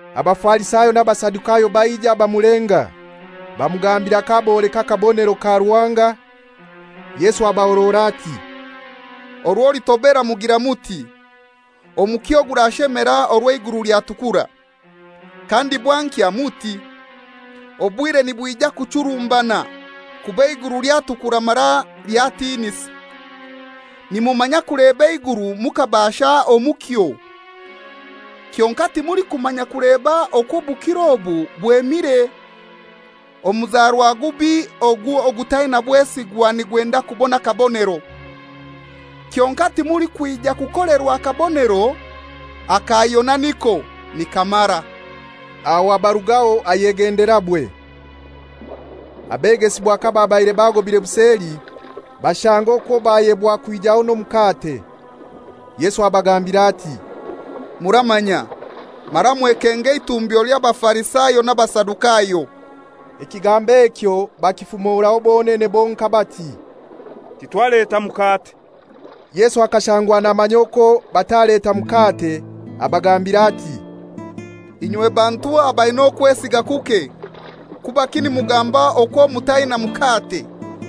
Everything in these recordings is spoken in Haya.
Abafarisayo n'Abasadukayo baija bamulenga. Bamugambira k'aboleka akabonero ka Ruhanga. Yesu abahorora ati, «Orwo litobera mugira muti, ‹Omukyo gurashemera orwo eiguru lyatukura.› Kandi bwankya muti, ‹Obwire nibwija kuchurumbana, kuba eiguru lyatukura mara lyatinisa.› Nimumanya kuleba eiguru mukabaasha omukyo, kyonkai timulikumanya kuleba okwo obukiro obu bwemire. Omuzarwa gubi ogu ogutaina bwesigwa nigwenda kubona akabonero. Kyonkai timulikwija kukolerwa kabonero; aka Yona niko, nikamara.» Aho abarugaho ayegenderabwe. Abegesibwa kababaire bagobire buseli, bashanga okwo bayebwa kwijaho n'omukate. Yesu abagambira ati, «Muramanya, mara mwekenge eitumbyo ly'Abafarisayo n'Abasadukayo.» Ekigambo ekyo bakifumoraho bonene bonkai bati, «Titwaleta mukate.» Yesu akashangwa namanya okwo bataleta mukate abagambira ati, «Inywe bantu abaina okwesiga kuke, kubaki nimugamba okwo mutaina mukate?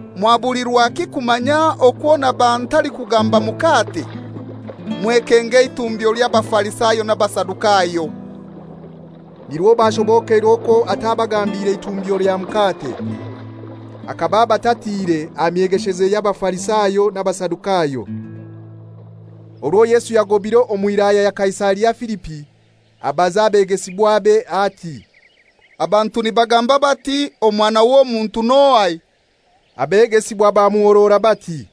Mwabulirwaki kumanya okwo naba ntalikugamba mukate? Mwekenge eitumbyo ly'Abafarisayo n'Abasadukayo.» Nirwo bashobokeirwe okwo atabagambiire itumbyo lya mukate, akaba abatatiire aha myegesheze y'Abafarisayo n'Abasadukayo. Orwo Yesu yagobire omu wilaya ya Kaisaria Filipi, abaza abegesibwabe ati, «Abantu nibagamba bati, Omwana w'Omuntu n'ohai?» Abegesibwa bamuhorora bati,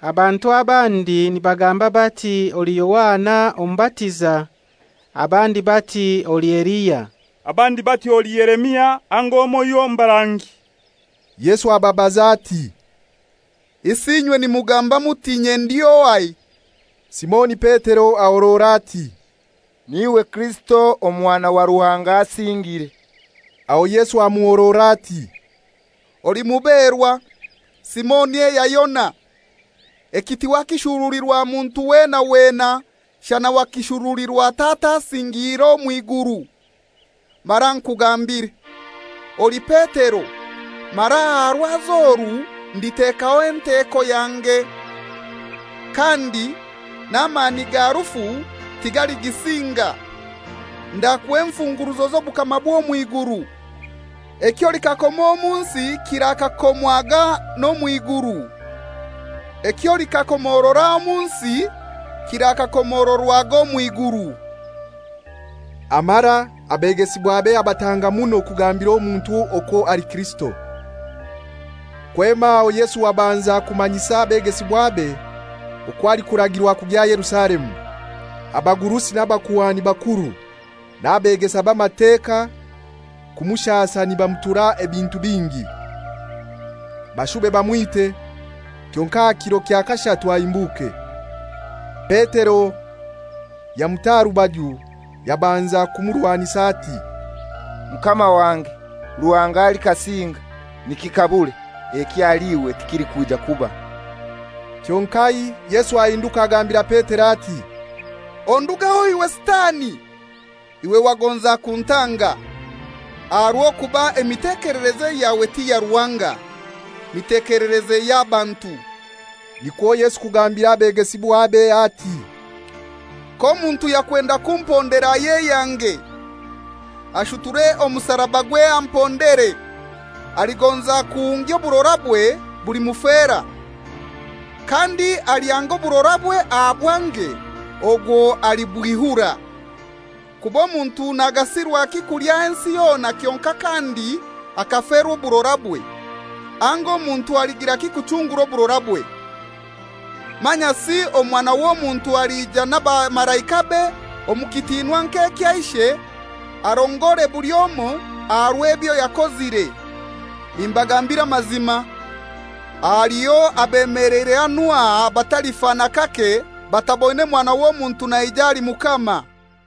«Abantu abandi nibagamba bati oli Yohana Omubatiza, abandi bati oli Eliya, abandi bati oli Yeremia anga omoiho omu barangi.» Yesu ababaza ati, «Isi inywe nimugamba muti inye ndi ohai?» Simoni Petero ahorora ati, «N'iwe Kirisito Omwana wa Ruhanga Asingire.» Aho Yesu amuhorora ati, «Oli muberwa, Simoni eya Yona! Eki tiwakishurulirwa muntu wena wena, shana wakishurulirwa Tata asingiire omw'iguru. Mara nkugambire, oli Petero, mara aha rwazi oru nditekaho enteko yange, kandi n'amani ga rufu tigaligisinga. Ndakuha enfunguruzo z'obukama bw'omw'iguru. Eky'olikakoma omu nsi kirakakomwaga n'omw'iguru; eky'olikakomorora omu omu nsi kirakakomororwaga omw'iguru.» Amara abegesibwabe abatanga muno kugambira omuntu okwo ali Kirisito. Kwema aho Yesu abanza kumanyisa abegesibwabe okwo alikuragirwa kugya Yerusalemu, abagurusi n'abakuhani bakuru n'abegesa b'Amateka kumushasa nibamutura ebintu bingi, bashube bamwite, kyonkai aha kiro kya kashatu ahimbuke. Petero yamuta aha rubaju yabanza kumurwanisa ati, «Mukama wange, Ruhanga alikasinga, nikikabure! Eki ahali iwe tikilikwija kuba.» Kyonkai Yesu ahinduka agambira Petero ati, «Ondugeho iwe Sitani! Iwe wagonza kuntanga, aha rw'okuba emitekelereze yawe ti ya Ruhanga, mitekelereze y'abantu.» Nikwo Yesu kugambira abegesibwabe ati, «K'omuntu yakwenda kumpondera ayeyange, ashuture omusarabagwe ampondere. Aligonza kuhungya oburorabwe bulimufera, kandi alyanga oburorabwe aha bwange ogwo alibwihura. Kuba omuntu nagasirwaki kulya ensi yona kyonkai kandi akaferwa oburorabwe? Anga omuntu aligiraki kuchungura oburorabwe? Manyasi Omwana w'Omuntu alija n'abamalaikabe omu kitinwa nk'ekya Ishe, arongore buli omoi aha rw'ebyo yakozire. Nimbagambira amazima, haliho abemeleire hanu aha abatalifa n'akake bataboine Mwana w'Omuntu naija ali Mukama.»